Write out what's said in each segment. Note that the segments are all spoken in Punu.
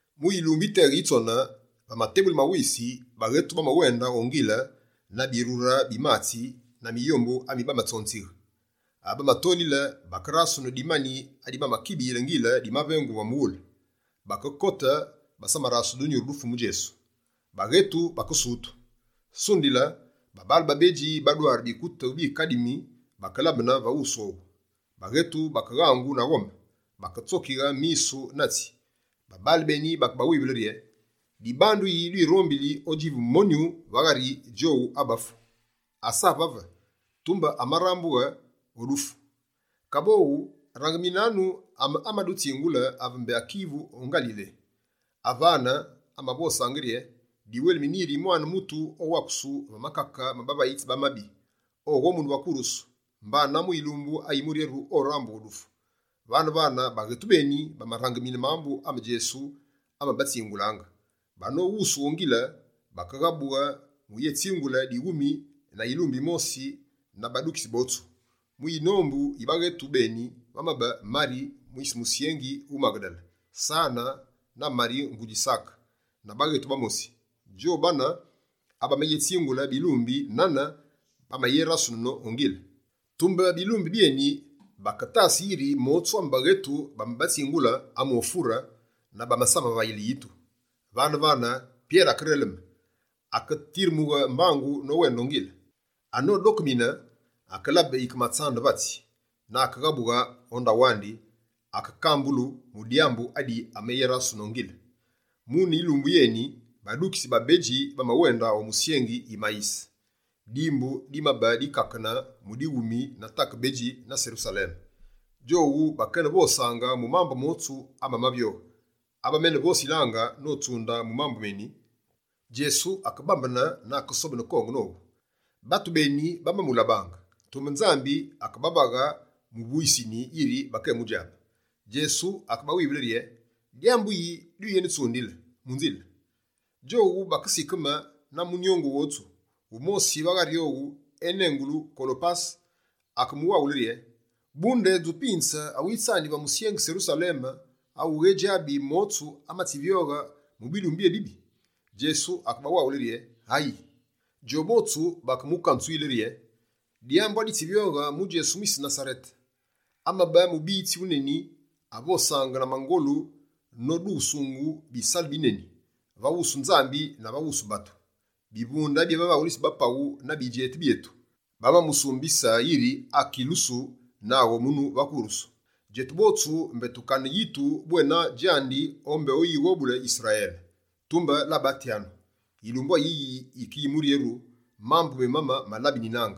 Mu yilumbu yiteghe yitsone, va matebughulu ma wisi, baghetu bamawende o ngile na birure bi matsi na miyombu ami bamatsonzighe. Ave bamatolile, bakerasunu dimani adi bamakibiyile ngile dimavengughu va mughule. Bakekote, basamarasunu dunyuru du Fumu Djesu. Baghetu, bakesutu. Sundile, babaale babedji badware bikutu bikadimi, bakelabene va wusu owu. Baghetu, bakeghangu na ghome, baketsokighe misu na tsi. Babaale beni bakebawivule rye: «Dibandu yi dwirombili odjivu monyu va ghari djowu abamafu? Asa vave, tumbe amarambughe o dufu. Kaboghu, rangiminanu ame amadutsingulanga ave mbé akivu o Ngalile. Avane, amavosaange rye: “Diwelimine yiri Mwane Mutu owakusu va makake ma bavayitsi ba mabi, oghomunu va kurusu, mbana mu yilumbu ayimuryeru, orambughe o dufu”.» Vane-vane, baghetu beni bamarangimine mambu ame Djesu amabatsingulaange. Banoghusughe o ngile, bakeghabughe muyetsingule dighumi na yilumbi yimosi na badukitsi botsu. Mu yinombu yi baghetu beni, vamabe Mari mwise musyengi wu Maghedale, Sane na Mari ngudji Sake, na baghetu bamosi. Djowu bane, abamayétsingule bilumbi nane bamayerasunine o ngile. Tumbe bilumbi byeni baketasange yiri motsu ame baghetu bamabatsingule, amofure na basamamavayile yitu. Vane-vane, Pyere akereleme, akatiremughe mbangu nowende o ngile. Anodokemine, akelabe yike matsande vatsi, na akeghabughe o ndaghu andi, akekambulu mu dyambu adi amayerasunu o ngile. Mune yilumbu yeni, badukitsi babedji bamawende o musyengi Yimayise, dimbu dimabe dikakene mu dighumi na take bedji na Serusaleme. Djowu bakenevosange mu mambu motsu amamavyoghe. Ave bamenevosilaange notsunde mu mambu meni, Djesu akebambene na akesobene konge nowu. Batu beni bamamulabaange, tumbe Nzambi akebavaghe muvuyisini yiri bakemujabe. Djesu akebawivule rye: «Dyambu yi dwiyenetsundile mu nzile?» Djowu, bakesikeme na munyongu wotsu. Wumosi va ghari owu, enengilu Kolopase, akemuwaghule rye: «Bu ndedju pinze awitsani va musyengi Serusaleme awughadjabe motsu amatsivyoghe mu bilumbu byébibi?» Djesu akebawaghule rye: «Ayii?» Djowu botsu bakemukanzuyile rye: «Dyambu aditsivyoghe mu Djesu mwise Nasarete. Amabe mubiyitsi wuneni avosange na mangolu nodughusungu bisalu bineni, va wusu Nzambi na va wusu batu. Bivunde bi bavaghulitsi ba paghu na bidjeti byetu, bamamusumbise yiri akekilusu na akeghomunu va kurusu. Djetu botsu mbé tukane yitu bwena djandi o mbé oyighobule mukute Yisrayele. Tumbe labatyanu, yilumbu ayiyi yike yi muryeru, mambu memane mamalabenine.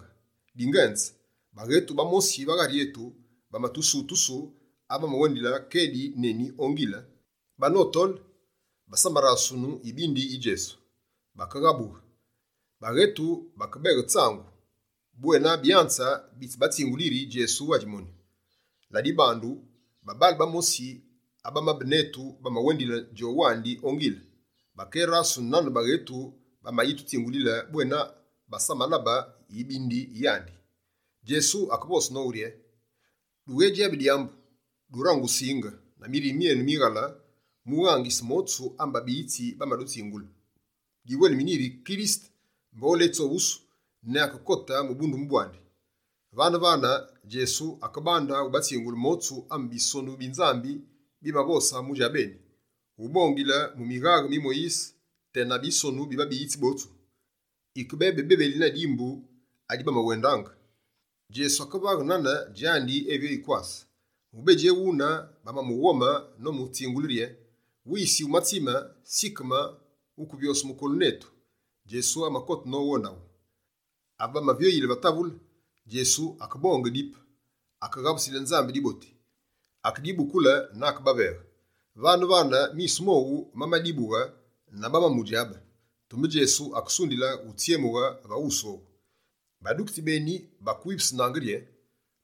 Dingenze, baghetu bamosi va ghari etu, bamatusutusu ave bamawendile kedi neni o ngile. Banotole, basamarasunu yibindi yi Djesu. Bakeghabughe, bakebeghe tsangu bwena Byanze bitsibatsingule yiri Djesu adji monyu. Ladibandu, babaale bamosi abamabe netu, bamawendile djowandi o ngile, bakérasunu nane baghetu bamayitutsingulile bwena basamalabe yibindi yandi.» Djesu akevose nowu rye: «Dughejabi dyambu, durange usinge, na mirime myenu mighale, mu ughangise motsu ame babiyitsi bamadutsingule! Diwelimine yiri Kirisete mbé oletsoghusu ne akekote mu bundumbe bwandi.» Vane-vane, Djesu akebande ubatsingule motsu ame Bisonu bi Nzambi bimavose mu djabeni: ubongile mu mighande mi Moyise tena mu Bisonu bi babiyitsi botsu. Yike bebi bebeli na dimbu adi bamawendaange, Djesu akevaghe nane djandi evyoyi kwase. Mubedji ewune, bamamughome nomutsingule rye: «Wisi wumatsime, sikeme wukevyose mukolu netu.» Djesu amakote nowu o ndaghu. Ave bamavyoyile va metse, Djesu akebonge dipe, akeghabusile Nzambi diboti, akedibukule na akebaveghe. Vane-vane, misu mowu mamadibughe na bamamudjabe. Tumbe Djesu akesundile, utsyemughe va wusu owu. Badukitsi beni bakewivusunaange rye: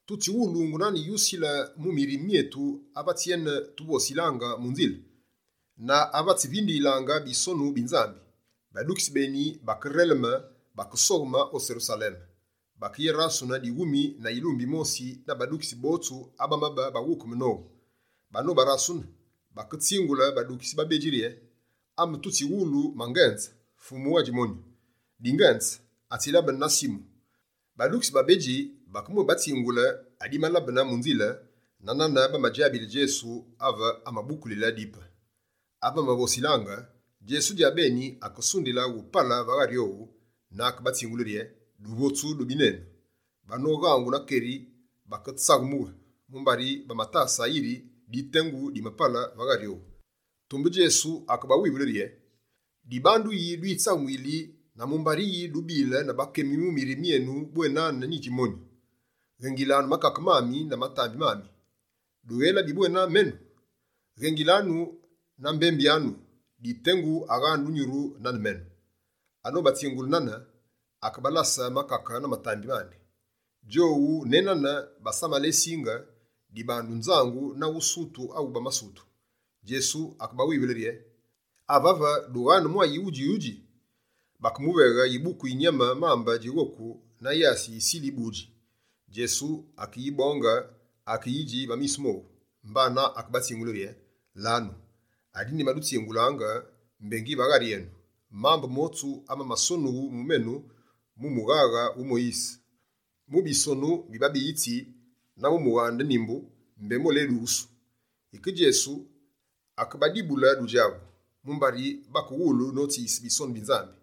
«Tutsighulungu nane yusile mu mirime myetu ave atsiyene tuvosilaange mu nzile, na ave atsiyene tuvindiyilaange Bisonu bi Nzambi!» Badukitsi beni, bakereleme, bakesogheme o Serusaleme. Bakeye rasune dighumi na yilumbi yimosi na badukitsi botsu abamabe baghukeme nowu. Banobarasune, baketsingule badukitsi babedji rye: «Ame tutsighulu mangenze, Fumu adji monyu! Dingenze, atsilabene na Simu!» Badukitsi babedji bakemwébatsingule adimalabe mu nzile na nane bamadjabile Djesu ave amabukulile dipe. Ave bamavosilaange, Djesu djabeni akesundile upale va ghari owu na akebatsingule rye: «Duvotsu dubi nenu!» Banoghangu na keri, baketsaghemughe, mumbari bamatasaange yiri ditengu dimapale va ghari owu. Tumbe Djesu, akebawivule rye: «Dibandu yi, dwitsaghemuyili na mumbari yi, dubile na bakemi mu mirime myenu bwena nyidji monyu? Ghengilanu makake na matambi mami: dughélabi bwena menu? Ghengilanu na mbembyanu, ditengu aghaane dunyuru nane menu.» Anobatsingule nane, akebalase makake na matambi mandi. Djowu ne nane basamalesinge, dibandu nzangu na usutu awu bamasutu. Djesu akebawivule rye: «Avave, dughaane mwa yighudji yi udji?» Bakemuveghe yibuku yi nyame mambe djighoku na yasi yi yisile yi budji. Djesu akeyibonge, akeyidji va misu mowu. Mbana, akebatsingule rye: «Lanu, adi nyimadutsingulaange mbé ngi va ghari enu: mambu motsu amamasonughu mu menu mu mughaghe wu Moyise, mu bisonu bi babiyitsi na mu mughande Nimbu, mbé moledughusu.» Yike Djesu, akebadibule dudjabu, mumbari bakewulu notsiyise Bisonu bi Nzambi.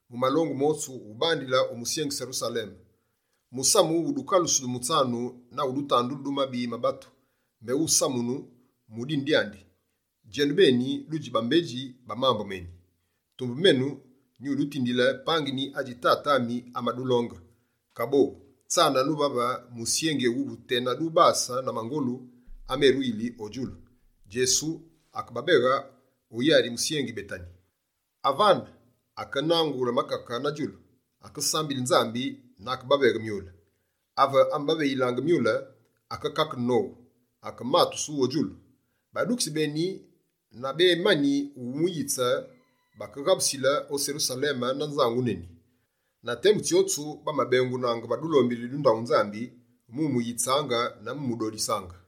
Mu malongu motsu, ubandile o musyengi Serusaleme, musamu wu dukalusu du mutsanu na wu dutandulu du mabi ma batu, mbé wusamunu mu dine dyandi. Djenubeni, dudji bambedji ba mambu meni. Tumbe menu, nyudutindile pangini adji Tate ami amadulonge. Kaboghu, tsananu vave musyengi éwuwu tena dubase na mangolu ameruyi o djulu.» Djesu akebabeghe o yari musyengi Betani. Avane, akenangule makake na djulu, akesambile Nzambi na akebaveghe myule. Ave amabaveyilaange myule, akekakene nowu, akematusu o djulu. Badukitsi beni nabemani wumuyitse, bakeghabusile o Serusaleme na nzangu neni. Na temu tsyotsu bamabengunange va dulombili du ndaghu Nzambi mu umuyitsaange na mu umudodisaange.